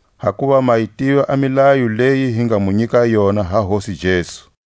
Hakuva ma yi tiva a milayo leyi hi nga mu nyika yona ha Hosi Jesu,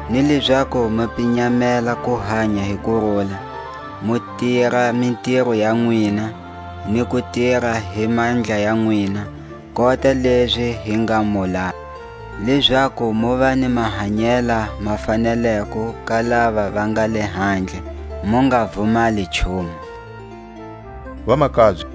ni lezaku mu pinyamela ku hanya hi kurula, mu tira mitiro ya nwina, ni ku tira hi mandla ya nwina, kota lezi hi nga mu laya, lezaku muva ni mahanyela ma faneleko ka lava va nga lehandle, mu nga vumali nchumu. A kuwuya ka Hosi.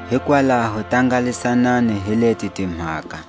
Hikwalaho tangalisanani hi leti timhaka.